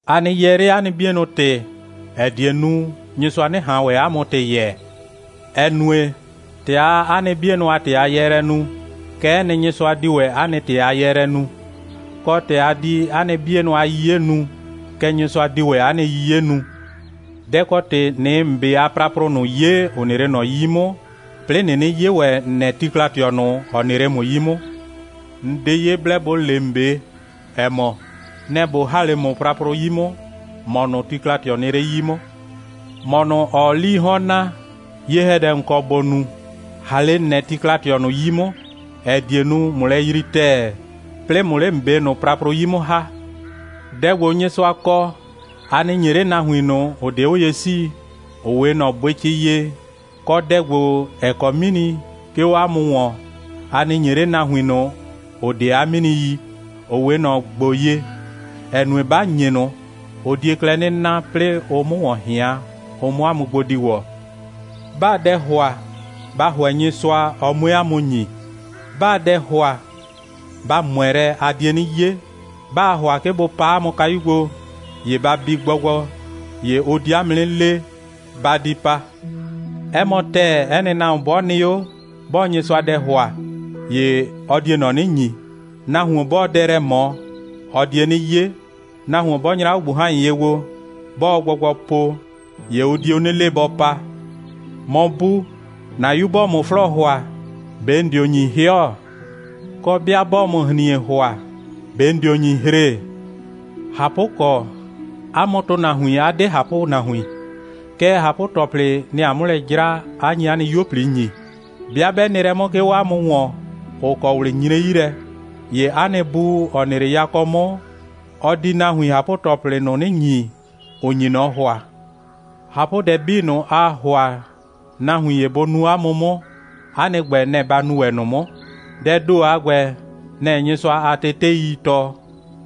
«A nɩ yɛɛ 'le 'a nɩ 'bienʋ ‑tɩ, ‑ɛ die nu, Nyɩsʋa 'nɩ ꞊han ‑wɛ 'a mʋ ‑tɩ yɛɛ, ‑ɛ nue, ‑tɛ aa 'a nɩ 'bienʋ a ‑tɩ a yɛɛlɛ nu, kɛ'ɛ nɩ, Nyɩsʋa di ‑wɛ 'a nɩ ‑tɩ a yɛɛlɛ nu, kɔ, ‑tɛ a di 'a nɩ 'bienʋ a 'yiye nu, kɛ Nyɩsʋa di ‑wɛ 'a nɩ 'yiye nu. Dɛ‑ kɔ ‑tɩ ꞊nɩɩ ‑n 'be a praprʋ ꞊nʋ 'ye, ‑ʋ nɩ 'le ꞊nɔ 'yi 'mʋ, 'plɩɩ ꞊nɩnɩ 'ye ‑wɛ ‑n nɛ tikla꞊tɩɔ ꞊nʋ, ‑ɔ nɩ 'le ‑mʋ 'yi 'mʋ? ‑N 'de ye blɛ ‑bo le ‑n 'be, ‑ɛ mɔ: Nɛ‑ ꞊bo ‑ha 'le ‑mʋ praprʋ 'yi 'mʋ, ‑mɔ ꞊nʋ, tikla꞊tɩɔ nɩ 'le 'yi 'mʋ. ‑Mɔ ꞊nʋ, ‑ɔɔ 'lii 'hɔn naa, ye‑hɛdɛ ‑n kɔ ‑bo nu, ‑ha 'le ‑n nɛ tikla꞊tɩɔ ꞊nʋ 'yi 'mʋ, ‑ɛ die nu, ꞊mʋ lɛ yrii ‑tɛɛ, 'plɩɩ ꞊mʋ 'le ‑n 'be ꞊nʋ praprʋ 'yi 'mʋ ‑ha. Dɛ ‑gbo, Nyɩsʋa kɔ, a nɩ ‑nye 'le nahuin ꞊nʋ, ‑ʋ 'de 'o ye 'sii, ‑ʋ 'we ꞊nɔ bʋɩcɩ ye, kɔ, dɛ ‑gbo, ‑ɛ kɔ 'mini, 'ke 'o 'a mʋ ‑wɔn, a nɩ ‑nye 'le nahuin ꞊nʋ, ‑ʋ 'de 'a 'mini yi, ‑ʋ 'we ꞊nɔ ‑gbo ye, ‑ɛ nue, 'ba ‑nye ꞊nʋ, ʋ die klɛ 'nɩ na, 'plɩɩ ʋ 'mʋ ‑wɔn ꞊hɩan, ʋ 'mʋ 'a mʋ gbo di ‑wɔ.» «'Baa dɛ ‑hʋa, ba ‑hʋɛ Nyɩsʋa, ɔ 'mue 'a mʋ ‑nyi. 'Baa dɛ ‑hʋa, ba ꞊mʋɛ lɛ, a die 'nɩ 'ye. 'Baa ‑hʋa 'ke bʋ paa 'a mʋ kayu gbo, ‑ye ba bi gbɔgbɔ, ‑ye ʋ di 'a mʋ 'nɩ le: Ba di pa. 'Ɛ mɔ ‑tɛɛ, 'ɛ nɩ nahuon 'bɔ nɩ 'o, 'bɔɔ Nyɩsʋa dɛ ‑hʋa, ‑ye ɔ die ꞊nɔ 'nɩ ‑nyi. Nahuon 'bɔɔ dɛ lɛ ꞊mɔ, ɔ die 'nɩ 'ye. Nahuon 'bɔ nyra 'o ꞊gbuhan.ye gbo, 'bɔɔ gbɔgbɔ po, ‑ye ʋ dio 'nɩ le, bɔ pa. ‑Mɔ bu, ‑na 'yu 'bɔɔ ‑mʋ 'flɔɔ ‑hʋa, ꞊be ‑n dio ‑nyi 'hɩɔ? Kɔ, 'bɩa 'bɔɔ ‑mʋ ‑hrin.e ‑hʋa, ꞊be ‑n dio ‑nyi hre? ꞊Hapʋkɔ, 'a mʋ ‑tʋnahuin 'a 'de ꞊hapʋnahuin, kɛɛ, ꞊hapʋ‑tɔplɩ, nɩ‑ aa 'mʋ lɛ 'jra, 'a nyi 'a nɩ 'yuo꞊pli ‑nyi. 'Bɩa 'bɛ nɩ lɛ 'mʋ, 'ke 'o 'a mʋ ‑wɔn, ‑ʋ kɔ ꞊wlɩ nyre 'yi lɛ, ‑ye 'a nɩ Bu, ‑ɔ nɩ 'le yakɔ 'mʋ, ɔ di nahuin ꞊hapʋ‑tɔplɩ ꞊nʋ 'nɩ ‑nyi, ‑ʋ nyi ꞊nɔ ‑hʋa. ꞊Hapʋdɛ 'bii ꞊nʋ, aa ‑hʋa nahuin ‑ye bʋ nu 'a mʋ 'mʋ, 'a nɩ ‑gbɛ, nɛ‑ ba nu ‑wɛ ꞊nʋ 'mʋ. Dɛɛ ‑do a ‑gbɛ, nɛ‑ Nyɩsʋa a teteii tɔɔ,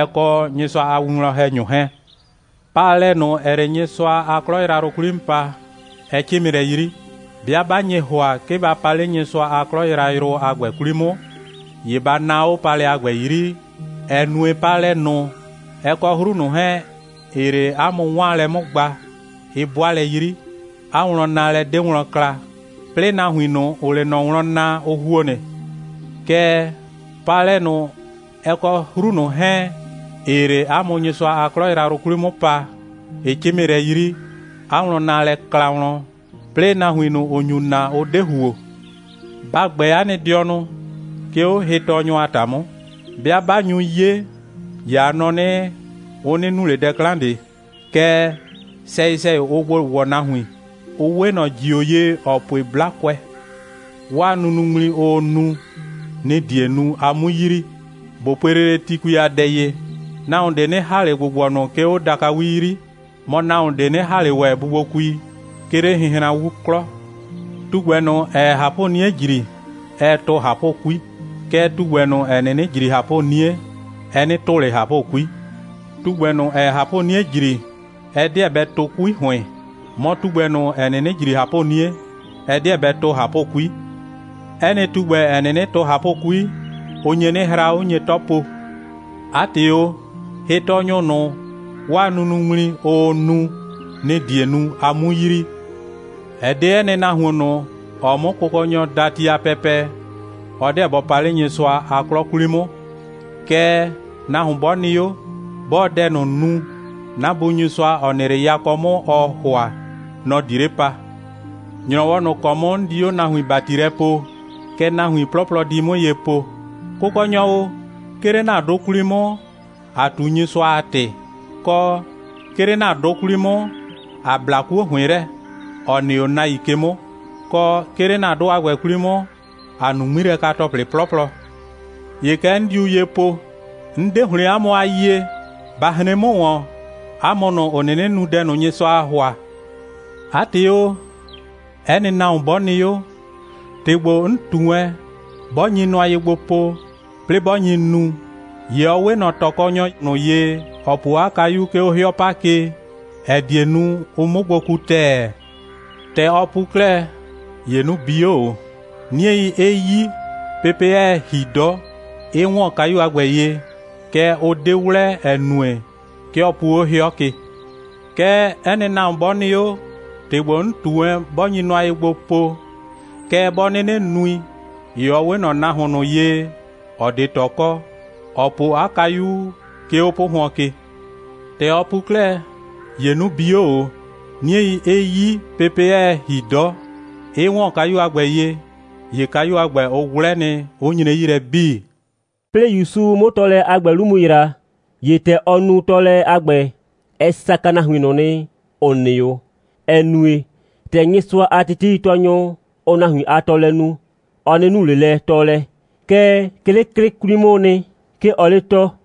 ɛ kɔ Nyɩsʋa a winwlɔn‑hɛnyʋ 'hɛɛn.» «Paalɛ ꞊nʋ, ‑ɛɛ 'le 'a mʋ Nyɩsʋa a 'klɔ yrayrʋ 'kwli 'mʋ paa, ɛ 'cɩmɩ lɛ 'yri. 'Bɩa 'ba nye ‑hʋa, 'ke ba pa 'le Nyɩsʋa a 'klɔ yrayrʋ a ‑gbɛ 'kwli 'mʋ, ‑ye ba naa 'o paalɛ a ‑gbɛ 'yri, ‑ɛ nue, paalɛ ꞊nʋ, ɛ kɔ 'hru ꞊nʋ 'hɛɛn, ‑ɩɩ 'le 'a mʋ 'waanlɛ 'mʋ gba, ɩ 'bʋa lɛ 'yri, 'a wlɔnnaalɛ 'de wlɔn kla, 'plɩɩ nahuin ꞊nʋ, ‑ʋʋ 'le ꞊nɔ wlɔn naa, ʋ ‑huo nɩ. Kɛɛ, paalɛ ꞊nʋ, ɛ kɔ 'hru ꞊nʋ 'hɛɛn, ‑ɩɩ 'le 'a mʋ Nyɩsʋa a 'klɔ yrayrʋ 'kwli 'mʋ paa, ɩ 'cɩmɩ lɛ 'yri, 'a wlɔnnaalɛ kla wlɔn, 'plɩɩ nahuin ꞊nʋ, ‑ʋ nyu na, ʋ 'de ‑huo.» «Ba ‑gbɛ 'a nɩ dɩɔnʋ, 'ke 'o hɩtɔɔnyʋ a ‑ta 'mʋ. 'Bɩa 'ba nyu 'ye, ‑ye a nɔ 'nɩ, ʋ 'nɩ nu ꞊le dɛ 'klan ꞊de. Kɛɛ, sɛyɩ‑sɛyɩ, ʋʋ gbo ‑wɔ nahuin. Ʋ 'we ꞊nɔ ‑jio ye, ‑ɔ pue 'blakʋɛ. 'Waa nunuŋmli, ʋʋ nu, nɩ‑ die nu, a 'mu yrii. ꞊Bo pue lele tikui a dɛ ye. Nahuon ꞊de 'nɩ ‑ha ꞊le ‑gbʋgbɔnʋ, 'ke 'o dakawi 'yri. Mɔ, nahuon ꞊de 'nɩ ‑ha ꞊le ‑wɛ bubuokui, 'ke 'le hɩnhranwu 'klɔ. Tugbɛ ꞊nʋ, ‑ɛɛ ꞊hapʋ'nie ‑jri, ɛɛ tʋ ꞊hapʋ'kui. Kɛɛ, tugbɛ ꞊nʋ, ‑ɛ 'nɩnɩ ‑jri ꞊hapʋ'nie, ɛ 'nɩ tʋ ꞊le ꞊hapʋ'kui. Tugbɛ ꞊nʋ, ‑ɛɛ ꞊hapʋ'nie ‑jri, ɛ 'deɛ bɛ tʋ 'kui ‑hʋɩn. Mɔ, tugbɛ ꞊nʋ, ‑ɛ 'nɩnɩ ‑jri ꞊hapʋ'nie, ɛ 'deɛ bɛ tʋ ꞊hapʋ'kui. 'Ɛ nɩ tugbɛ, ‑ɛ 'nɩnɩ tʋ ꞊hapʋ'kui, ʋ nye 'nɩ hra, 'ʋ nye 'tɔ po. 'A ‑tɩ o, hɩtɔɔnyʋ ꞊nʋ, 'waa nunuŋmli, ʋʋ nu, nɩ‑ die nu, a 'mu yrii.» «Ɛ 'de 'ɛ nɩ nahuon ꞊nʋ, ‑ɔɔ 'mʋ Kʋkɔnyɔ daa ti a pɛpɛ, ɔ 'deɛ bɔ pa 'le Nyɩsʋa a 'klɔ 'kwli 'mʋ. Kɛɛ, nahuon 'bɔ nɩ 'o, 'bɔɔ dɛ ꞊nʋ nu, 'na Bu Nyɩsʋa, ‑ɔ nɩ 'le yakɔ 'mʋ, ɔɔ ‑hʋa, nɔ‑ di 'le pa. ‑Nyrɔwɔ ꞊nʋ ‑kɔ 'mʋ 'n di 'o nahuin ‑bati lɛ poo, kɛ nahuin 'plɔplɔ di 'mʋ ye po: Kʋkɔnyɔ o, 'ke 'le ‑na 'dʋ 'kwli 'mʋ, ‑a ꞊tu Nyɩsʋa a ‑tɩ, kɔ, 'ke 'le ‑na 'dʋ 'kwli 'mʋ, ꞊a bla 'kuo ‑hʋɩn lɛ, ‑ɔ nɩ 'o nahuin ke 'mʋ, kɔ, 'ke 'le ‑na 'dʋ a ‑gbɛ 'kwli 'mʋ, ꞊a nu 'ŋmilɛka‑tɔplɩ 'plɔplɔ. ‑Ye kɛ 'n diu ye po: 'N 'de ‑hlɩn 'a mʋ a yie. Ba hren 'mʋ ‑wɔn, 'a mʋ ꞊nʋ, ‑ʋ 'nɩnɩ nu dɛ ꞊nʋ, Nyɩsʋaa ‑hʋa.» «'A ‑tɩ o, 'ɛ nɩ nahuon 'bɔ nɩ 'o, ‑tɩ ‑gbo, 'n ꞊tu wɛn, 'bɔ nyi nʋa ye gbo po, 'plɩɩ 'bɔ nyi nu, ‑ye ɔ 'we ꞊nɔ ꞊tɔkɔnyɔ ꞊nʋ ye, ‑ɔ po 'a kayu, 'ke 'o 'hɩɔ 'pa ke, ‑ɛ die nu, ʋ 'mʋ gbo ku ‑tɛɛ. ‑Tɛ ɔ pu 'klɛɛ, ‑ye 'nu bi 'o ꞊o, 'niei 'ɩ 'yi, pepe 'ɛɛ ‑hi 'dɔ, 'ɩ ‑wɔn kayu a ‑gbɛ ye, kɛɛ, ʋ 'de 'wlɛ, ‑ɛ nue, 'ke ɔ pu 'o 'hɩɔ ke. Kɛɛ, 'ɛ nɩ nahuon 'bɔ nɩ 'o, ‑tɩ ‑gbo 'n ꞊tu wɛn, 'bɔ nyi nʋa ye gbo po, kɛɛ, 'bɔ 'nɩnɩ nui, ‑ye ɔ 'we ꞊nɔ nahuon ꞊nʋ ye, ‑ɔ 'de ꞊tɔ kɔ, ‑ɔ po 'a kayu, 'ke 'o 'pʋhʋɔn ke. ‑Tɛ ɔ pu 'klɛɛ, ‑ye 'nu bi 'o ꞊o, 'niei 'ɩ 'yi, pepe 'ɛɛ ‑hi 'dɔ, 'ɩ ‑wɔn kayu a ‑gbɛ ye, ‑ye kayu a ‑gbɛ, ʋ 'wlɛ nɩ, 'ʋ nyre 'yi lɛ 'bii.» 'Plɩɩ ‑Yusu 'mʋ tɔɔlɛ a ‑gbɛ 'lu mu ‑yra, ‑ye ‑tɛ ɔ nu tɔɔlɛ a ‑gbɛ, ɛ saka nahuin ꞊nʋ nɩ, ‑ʋ nɩ 'o, ‑ɛ nue, ‑tɛ Nyɩsʋa a teteitɔɔnyʋ, ʋʋ nahuin a tɔɔlɛ nu, ɔ 'nɩ nu ꞊le lɛ tɔɔlɛ, kɛɛ, 'ke 'le 'klɩ 'kwli 'mʋʋ nɩ, 'ke ɔɔ 'le tɔɔ.